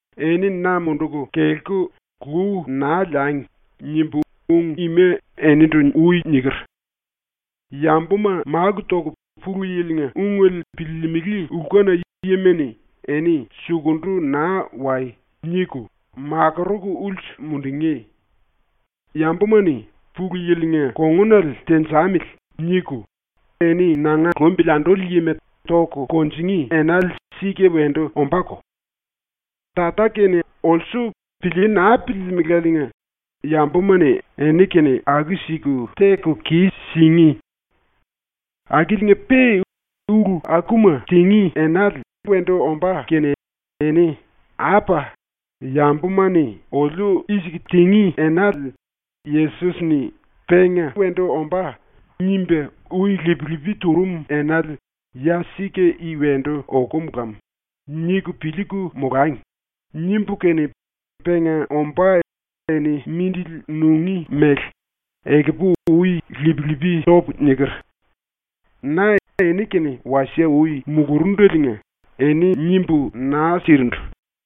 “‘Eni na munduku kelku lu naa liangi.’ nimbu ung ima enindu ui niker. Yambuma máku toku Pulu Yili-nga ungele piliilimili lkuna yima-ni eni “Sukundu naa wai!” niku makuruku ulsu mundungí. Yambuma-ni ‘Pulu Yili-nga kongunale tenjamili.’ niku eni nanga lumbili anduli yima toku kunjingí enale sika wendu ombáko. Tata-kene olsu pilíí naa piliilimiláliinga yambuma-ni eni-kene aku-siku teku kis-singí. “Akiliinga-pe ‘Ulu akuma tingí enale wendu ombá kene eni ‘Apa, yambuma-ni oliu i-siku tingí enale Yesos-ni “penga wendu ombá” nimba ui lip-lipi turum enale ya sika i wendu okum lam.’ niku piliiku molangi.’ nimbu kene penga ombá eni mindili nungí mele, ekupu ui lip-lipi topu niker. Na eni-kene wasie ui mulurundaliinga eni nimbu naa sirindu.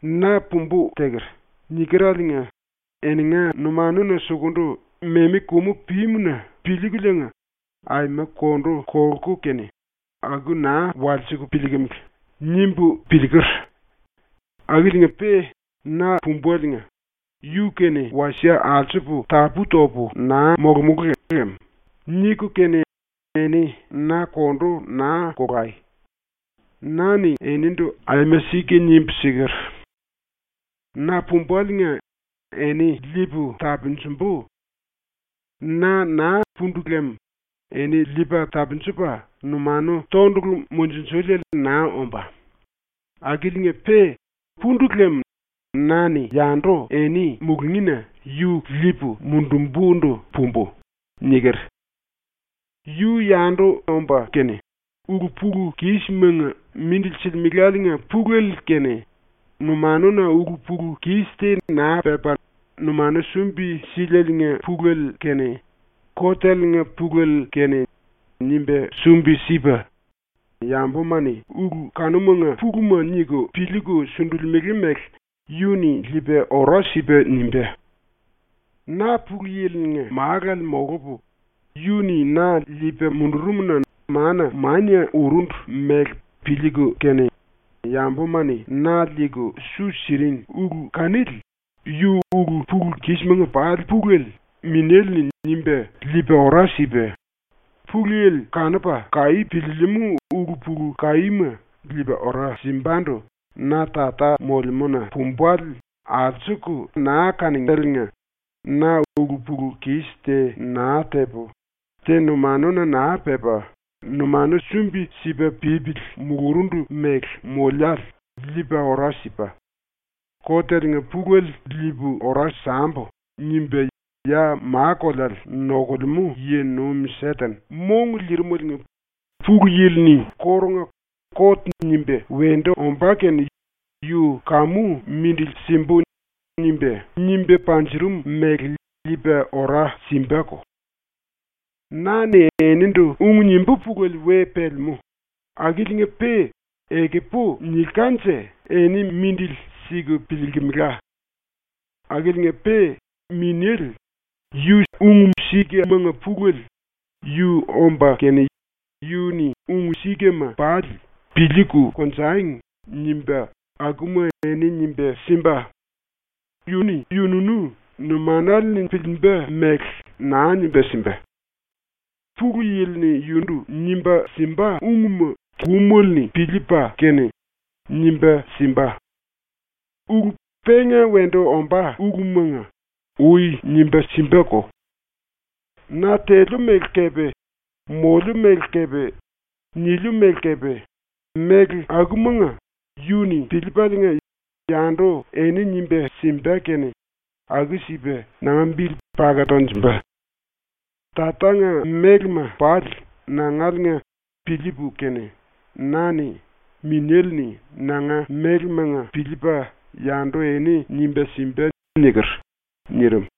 ‘ “Na pumbu teker.” nikereliinga eninga numanuna sukundu memi kumu pímu-na piliikuliinga aima kondu kolku kene aku naa walsiku piliikimili.’ nimbu piliiker. Akiliinga-pe na pumbaliinga ‘Yu-kene wasie alsupu tapú-topu naa molomulú lem.’ niku kene eni na kondu naa kolai. Na-ni enindu aima sika nimbu siker: “Na pumbaliinga eni liipu tapunjumbu. Na naa pundu lem eni Liipa Tapunjupa Numanu Tondulu Mundunjuliele naa ombá. Akiliinga-pe pundu lem na-ni yandu eni mulungína yu liipu mundumbundu pumbu.” niker. “Yu yandu omba kene, ulu-pulu-kismanga mindili silimelaliinga pulele kene numanuna ulu-pulu-kis te naa pepa numanu sumbi-sílieliinga pulele kene koteliinga pulele kene nimba sumbi-sipa, yambuma-ni ulu kanumanga puluma niku piliiku sundulimele mele yu-ni liipa ora sipa nimbá. Na Pulu Yili-nga Málale molupu, yu-ni na liipa mundurum-na mana mania urundu mele piliiku kene yambuma-ni na liiku su siring ulu kanili yu ulu-pulu-kismanga pali pulele Minéle-ni nimba liipa ora sipa; Pulu Yili kanupa kaí piliilimú ulu-pulu kaíma liipa ora simbandu na Tata molemúna pumbale alsuku naa kaningéliinga na ulu-pulu-kis te naa tepu, te numanuna naa pepa numanu sumbi-sipa pípili mulurundu mele moliále liipa ora sipa; ‘Koteliinga pulele liipu ora sambu.’ nimba ya ma-koleale nokulemú yi-nuim ⸤Seten⸥ mongu liirimeliinga Pulu Yili-ni kórunga ‘Kot nimba wendu ombá kene yu kamu mindili simbu.’ nimba, nimba panjurum mele liipa ora simbako. “Na-ni enindu ung nimbú pulele we pelemú, akiliinga-pe ekupu nilkanje eni mindili siku piliilkimila. Akiliinga-pe Minéle, yu sika-ungmanga pulele, yu omba kene, yu-ni ung-sikama pali ‘Piliiku konjangi.’ nimba akuma eni nimba simba. Yu-ni yu-yunu numanale-ni piliimba mele naa nimba simba. ⸤Pulu Yili-ni yundu nimba simba⸥ ungma kumele-ni piliipa kene nimba simba. Ulu penga wendu ombá ulumanga ui nimba simbako. Na teliu mele kepe moliu mele kepe niliu mele kepe méle akumanga yu-ni piliipaliinga yandu eni nimba simba kene aku-sipa nanga bili paka tonjumba. Tatanga mélema pali nangaliinga piliipu kene na-ni ‘Minéle-ni nanga mélemanga piliipa yandu eni nimba simba.’ niker.” ⸤nirim.⸥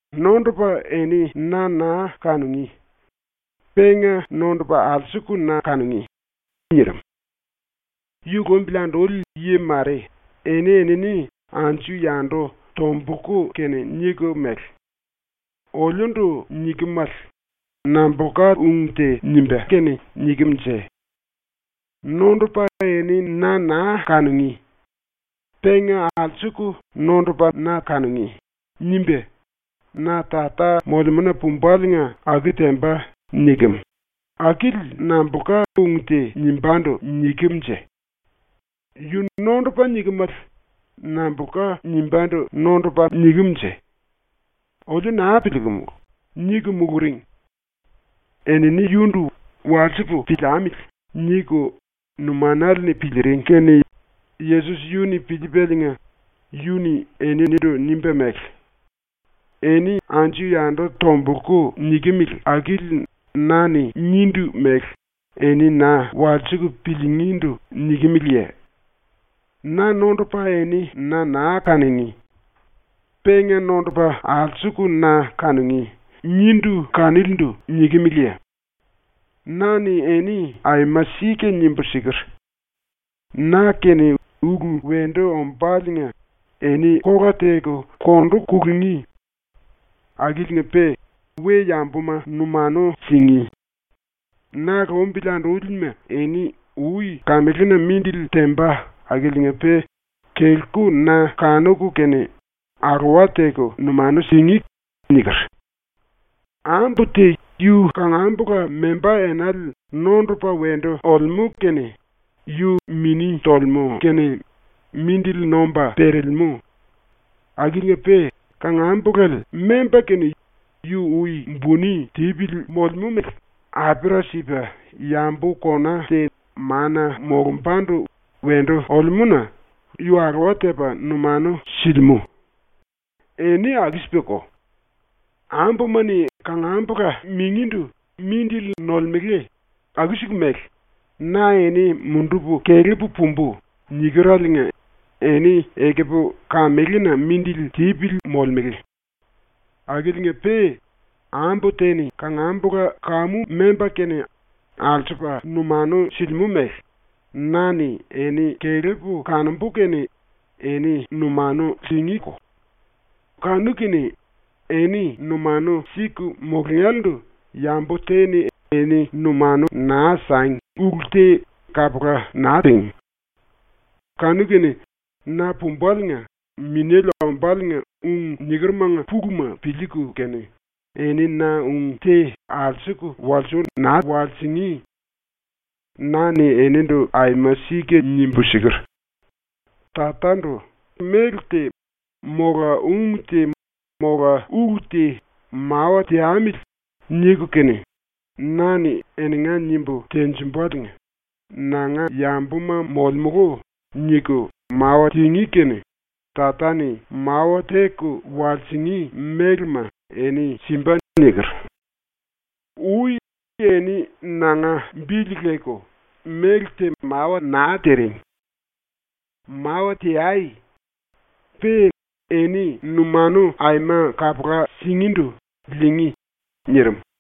“Nondopa eni na naa kanungí. Penga nondupa alsuku na kanungí.” nirim. Yu lumbili anduli yi mare eni-enini anju-yandu tombulku kene niku mele: “Oliundu nikemale nambulka ung te nimba kene nikem-nje? “Nondopa eni na naa kanungí. Penga alsuku nondupa na kanungí.” nimba, “Na Tata molemúna pumbaliinga aku temba.” nikem, akili nambulka ung te nimbándu nikem-nje? Yu “nondupa” nikemale nambulka nimbándu “nondupa” nikem-nje? Oliu naa piliikumulu.” niku muluring. Enini yundu ‘Walsipu piliamili.’ niku numanale-ni piliiring kene Yesos yu-ni piliipaliinga, yu-ni eninindu nimba mele: “Eni anju-yandu tombulku nikimili akili na-ni nindu mele eni na walsiku piliingíndu nikimeleye? “Na nondupa eni na naa kanungí. Penga nondupa alsuku na kanungí.” nindu kanilindu nikimeleye? Na-ni eni aima sika nimbu siker: “⸤Na-kene ulu wendu ombáliinga⸥ eni kola teku kondu kulungí. Akiliinga-pe we-yambuma numanu singí. Na lumbili andúlima eni ui kamelena mindili temba akiliinga-pe kelku na kanuku kene alowa teku numanu singí.” niker. “Ambu te yu kangambula membá enale nondupa wendu olemú kene yu mini tolemú kene mindili nomba perelemú. Akiliinga-pe kangambulale memba kene yu ui buni tipili molemú mele apera sipa yambu kona te mana molumbandu wendu olemú-na yu alowa tepa numanu silimú. Eni aku-sipako. Ambuma-ni kangambula mingíndu mindili nolemele aku-siku mele “Na eni mundupu kelepu pumbu.” nikereliinga eni ekupu kamelena mindili tipili molemele. Akiliinga-pe ambu te-ni kangambula kamu memba kene alsupa numanu silimú mele na-ni eni kelepu kanombu kene eni numanu singíko. Kanu-kene eni numanu siku mulungélendu yambu te-ni eni numanu naa sangi ulu te kapula naa tingí. “Kanu-kene na pumbaliinga Minéle ombáliinga ung nikerumanga puluma piliiku kene eni na ung te alsuku walsui naa walsingí. Na-ni enindu aima sika nimbu siker: “Tatandu méle te mola ung te mola ulu te ‘Mawa teamili.’ niku kene, na-ni eninga nimbu tenjimbaliinga ‘Nanga yambuma molemulu.’ niku mawa tingí kene Tata-ni mawa teku walsingí mélema eni simba.” niker. Ui eni nanga bili leku méle te mawa naa tiring. Mawa teai. Pe eni numanu aima kapula singíndu liingí.” ⸤nirim.⸥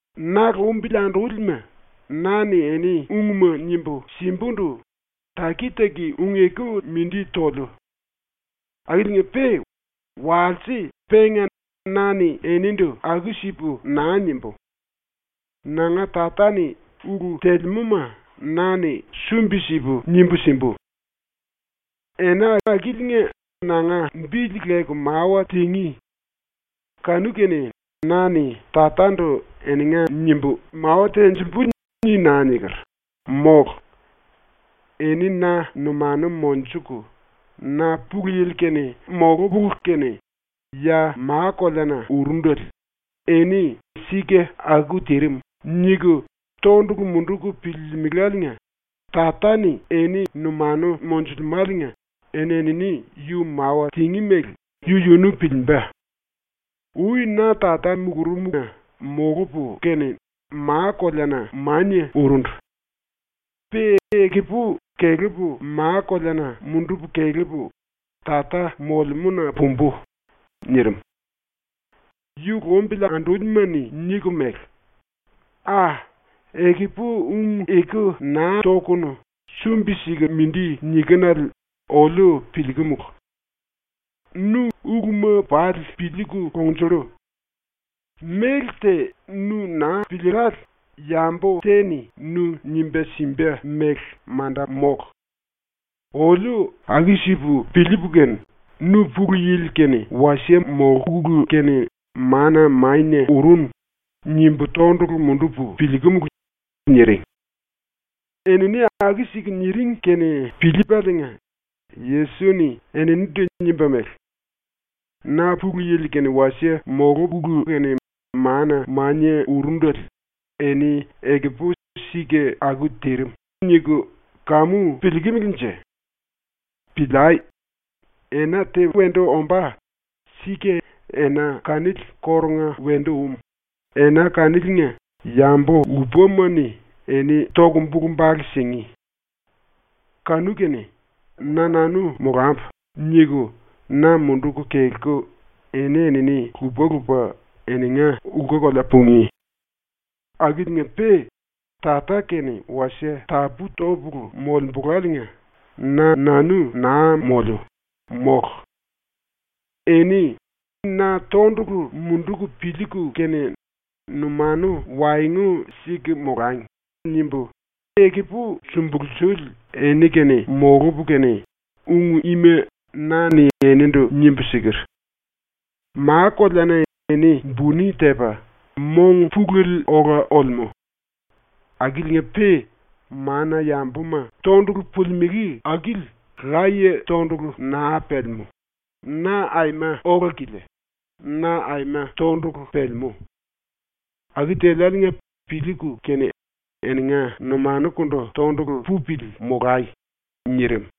“Na lumbili andúlima, na-ni eni ungma nimbu simbundu taki-taki ung-eku mindi toliu. Akiliinga-pe walse penga na-ni enindu aku-sipu naa nimbú. Nanga Tata-ni ulu telemúma na-ni sumbi-sipu nimbu simbu. Ena akiliinga nanga bili leku mawa tingí. Kanu-kene ‘Na-ni Tatandu eninga nimbu mawa tenjimbu.’ ni naa niker, mólu. Eni na numanu monjuku, na Pulu Yili-kene molupulu kene ya ma-koleana urundele eni ‘Sika aku tirim.’ niku tondulu munduku piliilimiléliinga Tata-ni eni numanu monjulemáliinga eni-enini yu mawa tingí mele yu-yunu piliimba. Ui na Tata mulurumna molupu kene ma-koleana mania urundu. Pe ekupu kelepu ma-koleana mundupu kelepu Tata molemúna pumbu.” nirim. Yu lumbili andúlima-ni niku mele: “A, ekupu ung-eku naa tokunu sumbi-siku mindi nikinele oliu piliikumulu. Nu uluma pali piliiku kongnjullu. Méle te nu naa piliillále yambu te-ni nu nimba simba méle manda mólu. Oliu aku-sipu piliipu kene ‘Nu Pulu Yili-kene wasie molkulu kene mana mania urunu.’ nimbu tondulu mundupu piliikumulu.” niring. ⸤Enini aku-siku niring kene piliipaliinga⸥ Yesos-ni eninindu nimba mele: “⸤Na Pulu Yili-kene wasie molupulu kene mana mania urundele⸥ eni ekupu ‘Sika aku tirim.’ niku kamu piliikimilinje? Piliai. Ena te wendu ombá, ⸤sika⸥ ena kanili kórunga wendu um, ena kaniliinga yambu lupama-ni eni toku bulu-bale singí. Kanu-kene ‘Na-nanu molambu.’ niku na munduku kelku eni-enini lupa-lupa eninga lku-kolea pungí. Akiliinga-pe Tata-kene wasie tapú-topulu molembuláliinga na-nanu naa moliu, mólu. “Eni ‘Na tondulu munduku piliiku kene numanu waengu siku molangi.’ nimbu ekupu sumbulsuli eni-kene molupu kene ung ima na-ni enindu nimbu siker. Ma-koleana eni buni tepa mong pulele ola olemú. Akiliinga-pe mana-yambuma tondulu pulimelé akili laye tondulu naa pelemú, na aima ola-kilia, na aima tondulu pelemú. Aku teliáliinga piliiku kene eninga numanukundu tondulu pupili molai.” nirim.